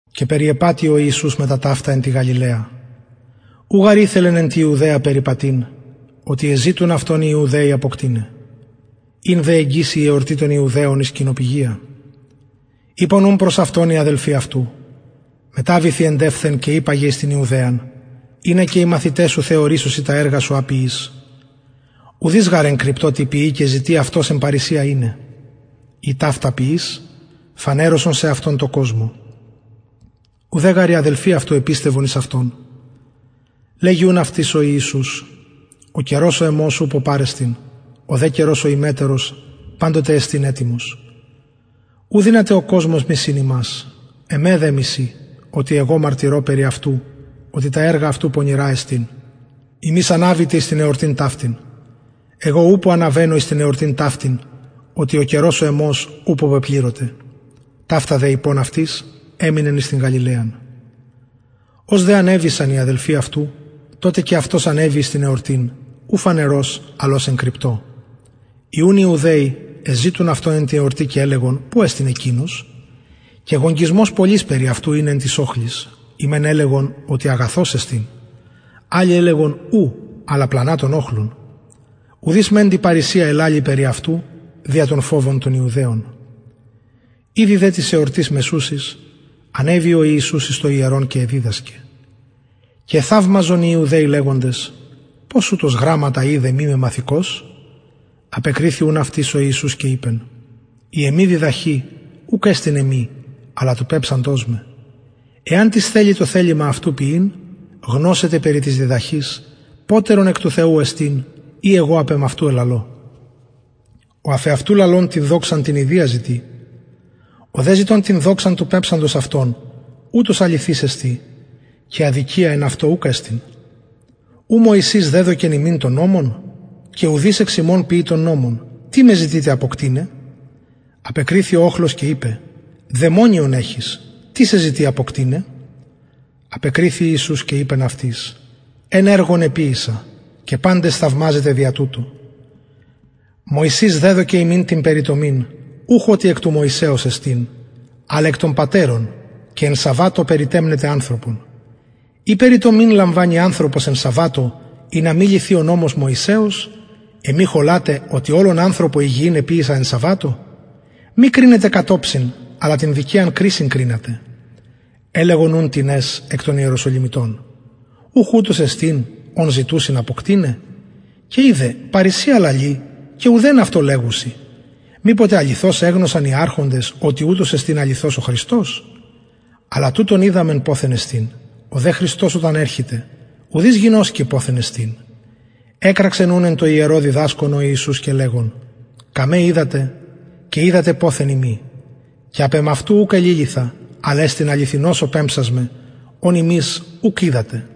και περιεπατει ο ιησους μετα ταυτα εν τη γαλιλαια ου γαρ ηθελεν εν τη ιουδαια περιπατειν οτι εζητουν αυτον οι ιουδαιοι αποκτειναι ην δε εγγυς η εορτη των ιουδαιων η σκηνοπηγια ειπον ουν προς αυτον οι αδελφοι αυτου μεταβηθι εντευθεν και υπαγε εις την ιουδαιαν ινα και οι μαθηται σου θεωρησωσιν τα εργα σου α ποιεις ουδεις γαρ εν κρυπτω τι ποιει και ζητει αυτος εν παρρησια ειναι ει ταυτα ποιεις φανερωσον σεαυτον τω κοσμω ουδε γαρ οι αδελφοι αυτου επιστευον εις αυτον λεγει ουν αυτοις ο ιησους ο καιρος ο εμος ουπω παρεστιν ο δε καιρος ο υμετερος παντοτε εστιν ετοιμος ου δυναται ο κοσμος μισειν υμας εμε δε μισει οτι εγω μαρτυρω περι αυτου οτι τα εργα αυτου πονηρα εστιν υμεις αναβητε εις την εορτην ταυτην εγω ουπω αναβαινω εις την εορτην ταυτην οτι ο καιρος ο εμος ουπω πεπληρωται ταυτα δε ειπων αυτοις εμεινεν εν τη γαλιλαια ως δε ανεβησαν οι αδελφοι αυτου τοτε και αυτος ανεβη εις την εορτην ου φανερως αλλ ως εν κρυπτω οι ουν ιουδαιοι εζητουν αυτον εν τη εορτη και ελεγον που εστιν εκεινος και γογγυσμος πολυς περι αυτου ην εν τοις οχλοις οι μεν ελεγον οτι αγαθος εστιν αλλοι ελεγον ου αλλα πλανα τον οχλον ουδεις μεντοι παρρησια ελαλει περι αυτου δια τον φοβον των ιουδαιων ηδη δε της εορτης μεσουσης ανεβη ο ιησους εις το ιερον και εδιδασκεν και εθαυμαζον οι ιουδαιοι λεγοντες πως ουτος γραμματα οιδεν μη μεμαθηκως απεκριθη ουν αυτοις ο ιησους και ειπεν η εμη διδαχη ουκ εστιν εμη αλλα του πεμψαντος με εαν τις θελη το θελημα αυτου ποιειν γνωσεται περι της διδαχης ποτερον εκ του θεου εστιν η εγω απ εμαυτου λαλω ο αφ εαυτου λαλων την δοξαν την ιδιαν ζητει ο δε ζητων την δοξαν του πεμψαντος αυτον ουτος αληθης εστιν και αδικια εν αυτω ουκ εστιν ου μωσης δεδωκεν υμιν τον νομον και ουδεις εξ υμων ποιει τον νομον τι με ζητειτε αποκτειναι απεκριθη ο οχλος και ειπεν δαιμονιον εχεις τις σε ζητει αποκτειναι απεκριθη ιησους και ειπεν αυτοις εν εργον εποιησα και παντες θαυμαζετε δια τουτο μωσης δεδωκεν υμιν την περιτομην ουχ οτι εκ του μωσεως εστιν αλλ εκ των πατερων και εν σαββατω περιτεμνετε ανθρωπον ει περιτομην λαμβανει ανθρωπος εν σαββατω ινα μη λυθη ο νομος μωσεως εμοι χολατε οτι ολον ανθρωπον υγιη εποιησα εν σαββατω μη κρινετε κατ οψιν αλλα την δικαιαν κρισιν κρινατε ελεγον ουν τινες εκ των ιεροσολυμιτων ουχ ουτος εστιν ον ζητουσιν αποκτειναι και ιδε παρρησια λαλει και ουδεν αυτω λεγουσιν μηποτε αληθως εγνωσαν οι αρχοντες οτι ουτος εστιν αληθως ο χριστος αλλα τουτον οιδαμεν ποθεν εστιν ο δε χριστος οταν ερχηται ουδεις γινωσκει ποθεν εστιν εκραξεν ουν εν τω ιερω διδασκων ο ιησους και λεγων καμε οιδατε και οιδατε ποθεν ειμι και απ εμαυτου ουκ εληλυθα αλλ εστιν αληθινος ο πεμψας με ον υμεις ουκ οιδατε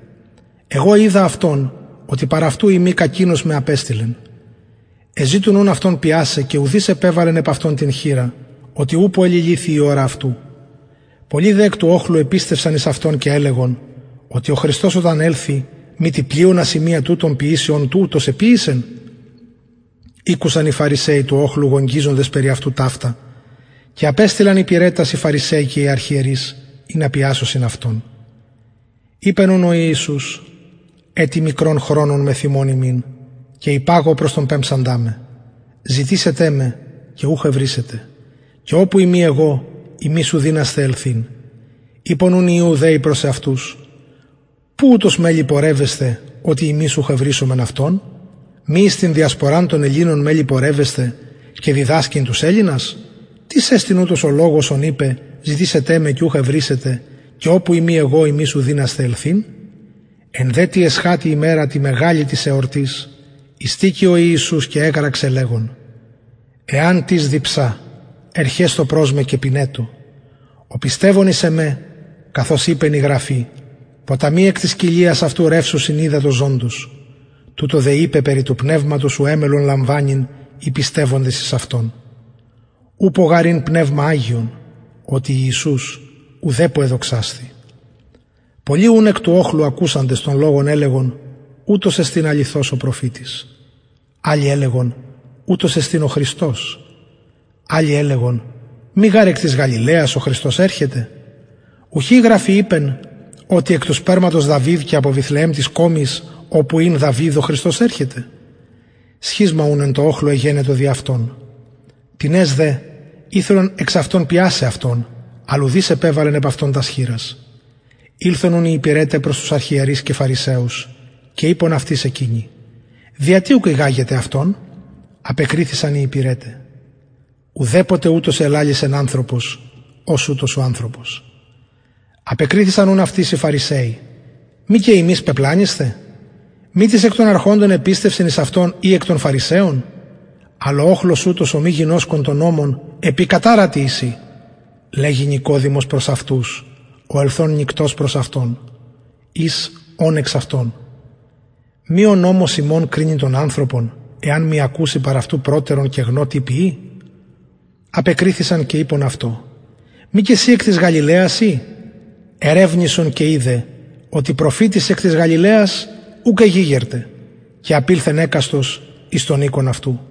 εγω οιδα αυτον οτι παρ αυτου ειμι κακεινος με απεστειλεν εζητουν ουν αυτον πιασαι και ουδεις επεβαλεν επ αυτον την χειρα οτι ουπω εληλυθει η ωρα αυτου πολλοι δε εκ του οχλου επιστευσαν εις αυτον και ελεγον οτι ο χριστος οταν ελθη μητι πλειονα σημεια τουτων ποιησει ων ουτος εποιησεν ηκουσαν οι φαρισαιοι του οχλου γογγυζοντος περι αυτου ταυτα και απεστειλαν υπηρετας οι φαρισαιοι και οι αρχιερεις ινα πιασωσιν αυτον ειπεν ουν ο ιησους ετι μικρον χρονον μεθ υμων ειμι και υπαγω προς τον πεμψαντα με ζητησετε με και ουχ ευρησετε και οπου ειμι εγω υμεις ου δυνασθε ελθειν ειπον ουν οι ιουδαιοι προς εαυτους που ουτος μελλει πορευεσθαι οτι ημεις ουχ ευρησομεν αυτον μη εις την διασποραν των ελληνων μελλει πορευεσθαι και διδασκειν τους ελληνας τις εστιν ουτος ο λογος ον ειπεν ζητησετε με και ουχ ευρησετε και οπου ειμι εγω υμεις ου δυνασθε ελθειν εν δε τη εσχατη ημερα τη μεγαλη της εορτης ειστηκει ο ιησους και εκραξεν λεγων εαν τις διψα ερχεσθω προς με και πινετω ο πιστευων εις εμε καθως ειπεν η γραφη ποταμοι εκ της κοιλιας αυτου ρευσουσιν υδατος ζωντος τουτο δε ειπεν περι του πνευματος ου εμελλον λαμβανειν οι πιστευοντες εις αυτον ουπω γαρ ην πνευμα αγιον οτι ιησους ουδεπω εδοξασθη πολλοι ουν εκ του οχλου ακουσαντες τον λογον ελεγον ουτος εστιν αληθως ο προφητης αλλοι ελεγον ουτος εστιν ο χριστος αλλοι ελεγον μη γαρ εκ της γαλιλαιας ο χριστος ερχεται ουχι η γραφη ειπεν οτι εκ του σπερματος δαυιδ και απο βηθλεεμ της κωμης οπου ην δαυιδ ο χριστος ερχεται σχισμα ουν εν τω οχλω εγενετο δι αυτον τινες δε ηθελον εξ αυτων πιασαι αυτον αλλ ουδεις επεβαλεν επ αυτον τας χειρας ηλθον ουν οι υπηρεται προς τους αρχιερεις και φαρισαιους και ειπον αυτοις εκεινοι δια τι ουκ ηγαγετε αυτον απεκριθησαν οι υπηρεται ουδεποτε ουτως ελαλησεν ανθρωπος ως ουτος ο ανθρωπος απεκριθησαν ουν αυτοις οι φαρισαιοι μη και υμεις πεπλανησθε μη τις εκ των αρχοντων επιστευσεν εις αυτον η εκ των φαρισαιων αλλ ο οχλος ουτος ο μη γινωσκων τον νομον επικαταρατοι εισιν λεγει νικοδημος προς αυτους ο ελθων νυκτος προς αυτον εις ων εξ αυτων μη ο νομος ημων κρινει τον ανθρωπον εαν μη ακουση παρ αυτου προτερον και γνω τι ποιει απεκριθησαν και ειπον αυτω μη και συ εκ της γαλιλαιας ει ερευνησον και ιδε οτι προφητης εκ της γαλιλαιας ουκ εγηγερται και επορευθη εκαστος εις τον οικον αυτου